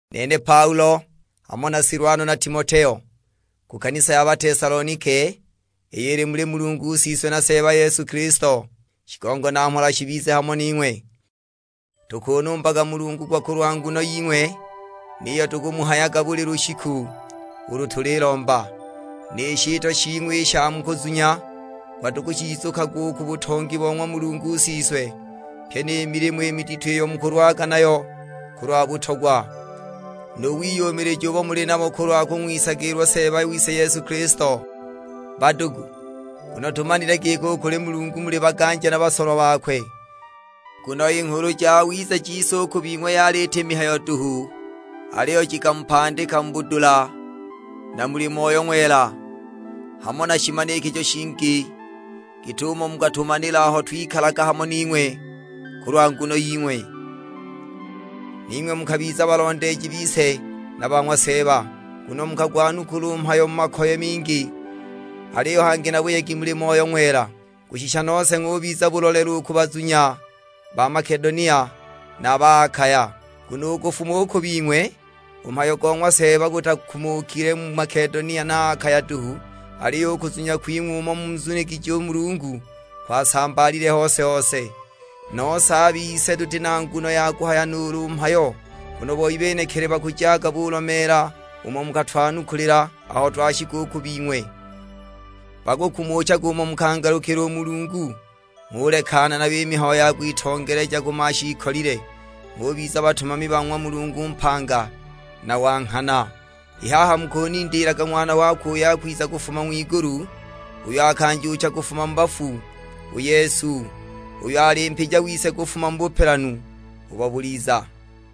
Nene Paulo, hamo na Silwano na Timoteo; ku kanisa ya Batesalonike iyo ili muli Mulungu Siswe na Seeba Yesu Kilisto. Shigongo na mhola shibize hamo ning'we. Tukunumbaga Mulungu gwa kulwa nguno ying'we, niyo tukumuhayaga buli lushiku ulu tulilomba. Ni shitwa shing'we i sha mu kuzunya, gwa tukushizukagwa u ku butongi bo ng'wa Mulungu Siswe; pyi ni milimo i midito iyo mukulwaga nayo kulwa butogwa, nu wiyumilija ubo muli nabo kulwa kung'wisagilwa Seeba wise Yesu Kilisto. Badugu, tumanile giki u kuli Mulungu muli baganja na basolwa bakwe. Nguno i Nghulu Jawiza jise u ku bing'we yali iti mihayo duhu, aliyo jikamupandika mu budula na muli Moyo Ng'wela, hamo na shimanikijo shingi; git'umo mukatumanila aho twikalaga hamo ning'we kulwa nguno ying'we. Ning'we mukabiza balondeeji bise na ba ng'wa Seeba, nguno mukagwanukula u mhayo mu makoye mingi; aliyo hangi na buyegi muli Moyo Ng'wela. Kushisha nose ng'ubiza bulolelo u ku bazunya ba Makedonia, na a ba Akaya. Nguno u kufuma u ku bing'we, u mhayo go ng'wa Seeba gutakumukile mu Makedonia na Akaya duhu, aliyo u kuzunya kwing'we umo munzunigije u Mulungu kwasambaalile hose-hose; nose a bise tuti na nguno ya kuhaya nuulu mhayo. Nguno boi benekili bakujaga bulomeela umo mukatwanukulila aho twashika u ku bing'we. Bakukumuchaga umo mukangalukila u Mulungu, ng'ulekana nayo i mihayo ya kwitongeleja ku mashiikolile, ng'ubiza batumami ba ng'wa Mulungu mpanga na wa nghana. I haha mukunindiilaga Ng'wana wakwe uyo akwiza kufuma ng'wigulu, uyo akanjuucha kufuma mu bafu, u Yesu, uyo ali mpija wise kufuma mu bupelanu ubo buliza.